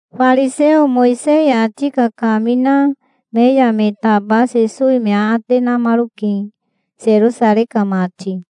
Fariseo Mowisei ati kakamina me ya me taba Sesowi me aate namaroke, Serosarei ka mati.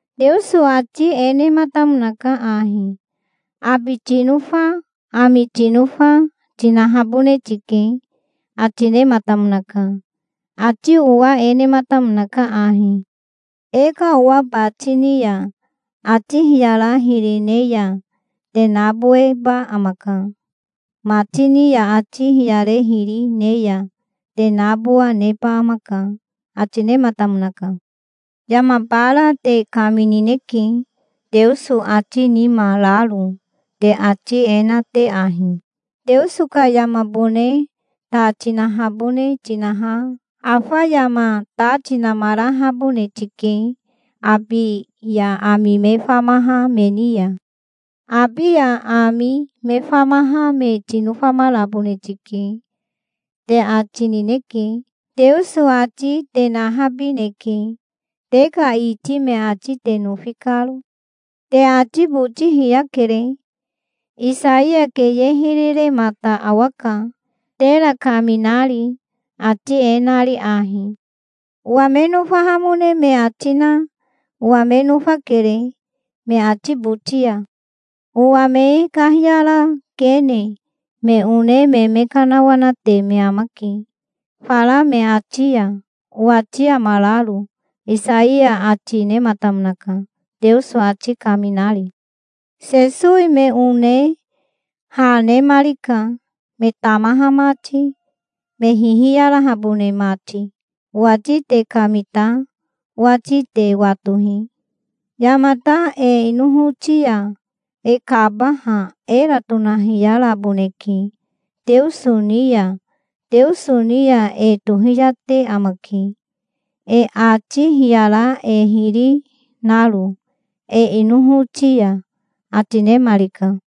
Teoso ati e nematamonaka ahi: 'Abi tinofa, ami tinofa, tinahabone tike', ati nematamonaka. Ati owa e nematamonaka ahi: 'E ka owa bati ni ya ati hiyara hiri ne ya te naboweba amaka. Mati ni ya ati hiyare hiri, ne ya te nabowa neba amaka', ati nematamonaka. Yama bara te kaminineke, Teoso ati nima raro, te ati e na te ahi: 'Teoso ka yamabone ta tinahabone tinaha afa yama ta tinamarahabone tike abi ya ami me famaha me ni ya. Abi ya ami me famaha me tinofamarabone tike', te ati nineke. Teoso ati te nahabineke, te ka iti me ati te nofi karo. Te ati boti hiyakere. Isaiya keye hiri remata awaka, tera kaminari, ati e nari ahi: 'Owa me nofahamone me ati na owa me nofakere me ati boti ya. Owa me kahiyara kene. Me one me me kanawanate me amake fara me ati ya, owati amararo', Isaiya ati nematamonaka, Teoso ati kaminari". Sesowi me one ha nemarika, me tamaha mati, me hihiyarahabone mati. "Owati te kamita. Owati te watohi. Yamata e inohoti ya e kabaha era tonahiyaraboneke Teoso ni ya. Teoso ni ya e tohiyate amake, e ati hiyara e hiri naro e inohoti ya", ati nemarika.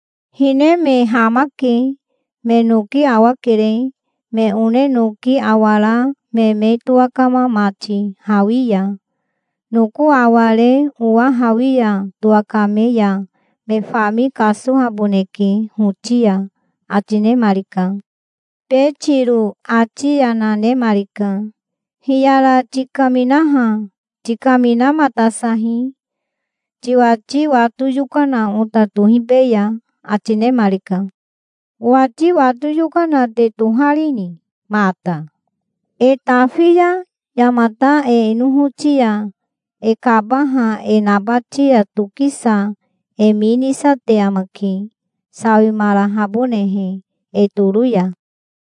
Hine me hamake. Me noki awakere, me one noki awara me me towakama mati hawi ya. Noko aware owa hawi ya towakame ya me fami kasohaboneke hoti ya", ati nemarika. Betiro ati yana nemarika. "Hiyara tikaminaha tikaminamatasahi. Tiwati wato yokana ota tohibeya", ati nemarika. "Owati wato yokana te toharini mata? E tafi ya yamata e inohoti ya e kabaha e nabati ya tokisa e mi nisate amake, sawimarahabonehe e toro ya.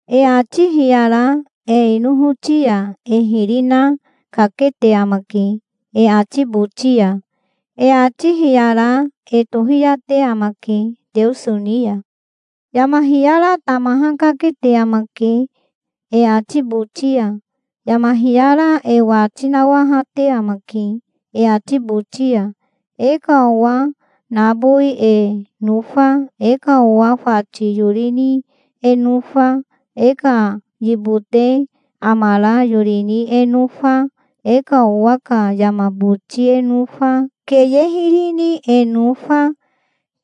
E ati hiyara e inohoti ya e hiri na kakete amake e ati boti ya. E ati hiyara e tohiyate amake Teoso ni ya. Yama hiyara tamaha kakete amake e ati boti ya. Yama hiyara e wati nawahate e amake e ati boti ya. E ka owa nabowi e nofa, e ka owa fati yori ni e nofa, e ka yibote amara yori ni e nofa, e ka owa ka yama boti e nofa, keye hiri ni e nofa,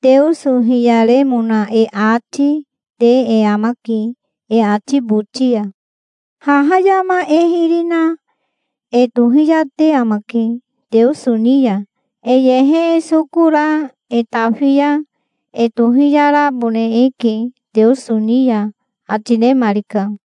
Teoso hiyaremona e ati, te e amake e ati boti ya. Haha yama e hiri na e tohiyate amake Teoso ni ya. E yehe e soko ra e tafi ya e tohiyarabone eke Teoso ni ya", ati nemarika.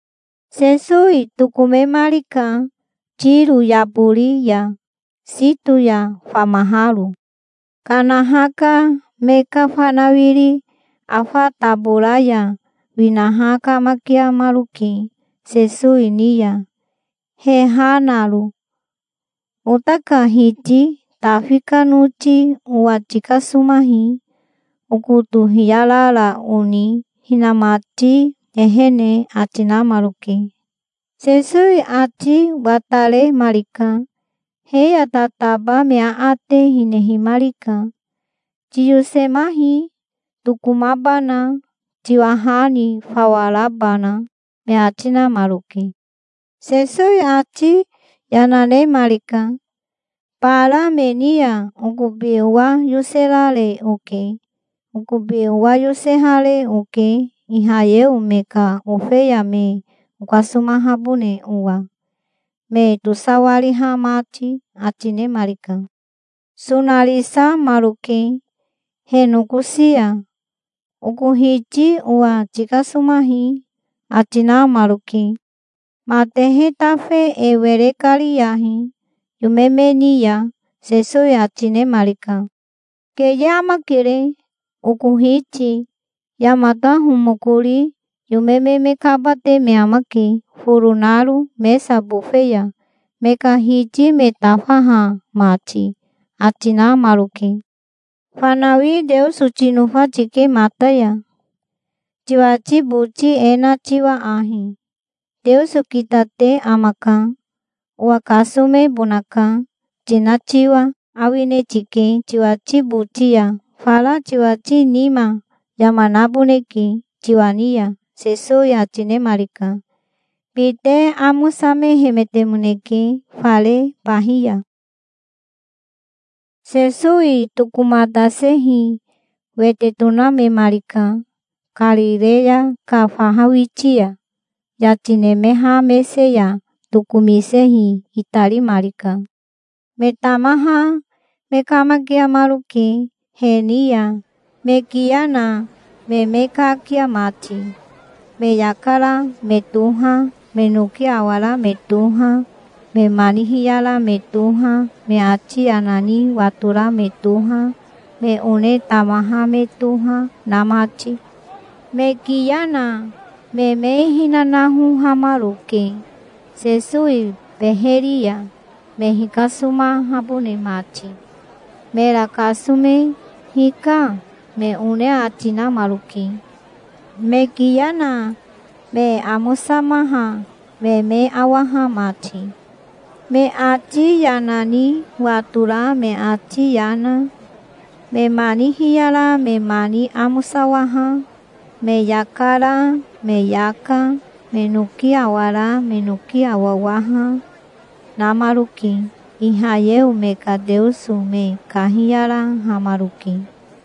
Sesowi tokomemarika Tiro yabori ya, Sito ya famaharo. Kanaha ka me ka fanawiri afa tabora ya winaha kamakiamaroke Sesowi ni ya, he ha naro. "Ota ka Hiti, Tafi ka noti, owa tikasomahi. Okoto hiyarara oni hinamati ehene", ati namaroke. Sesowi ati wataremarika. He ya tataba me aate hinehimarika. "Tiyosemahi, tokomabana, tiwa ha ni fawa rabana", me ati namaroke. Sesowi ati yana nemarika. "Bara me ni ya okobi owa yoserare oke. Okobi owa yosehare oke Ihayeo me ka ofeya me okasomahabone owa, me tosawariha mati", ati nemarika. Sonarisamaroke he nokosi ya. "Oko Hiti owa tikasomahi", ati namaroke. "Matehe tafe e were kariyahi yome me ni ya", Sesowi ati nemarika. "Keye amakere oko Hiti. Yamata homokori yome me kabate me amake foro naro mesa bofe ya, me ka hiti me tafaha mati", ati namaroke. "Fanawi Teoso tinofa tike mata ya, tiwati boti e na tiwa ahi, 'Teoso kitate amaka. Owa kasomebonaka', tina tiwa awine tike tiwati boti ya. Fara tiwati nima yama naboneke tiwa ni ya", Sesowi ati nemarika. Bite amosamehemetemoneke fare bahi ya. Sesowi tokomatasehi wete tonamemarika Karireya ka faha witi ya. Yati nemeha mese ya tokomisehi itarimarika. Me tamaha me kamakiamaroke he ni ya, me kiya na me me kakia mati, me yaka ra me toha, me noki awara me toha, me mani hiyara me toha, me ati yana ni watora me toha, me one tamaha me toha, na mati. Me kiya na me me hinanahohamaroke Sesowi beheri ya, me hikasomahabone mati. Mera kasome "Hika", me one ati namaroke, me kiya na me amosamaha me me awaha mati. Me ati yana ni watora me ati yana, me mani hiyara me mani amosawaha, me yaka ra me yaka, me noki awara me noki awawaha, namaroke. Ihayeo me ka Teoso me kahiyarahamaroke.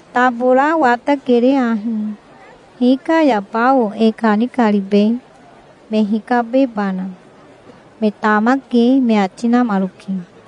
"Tabora watakere ahi. Hika ya bao e kanikaribe, me hikabebana? Me tamake", me ati namaroke.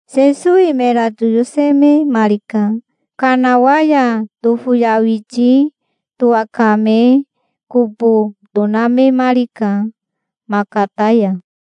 Sesowi mera toyosememarika. Kanawa ya tofoyawiti towakame kobo tonamemarika Makata ya.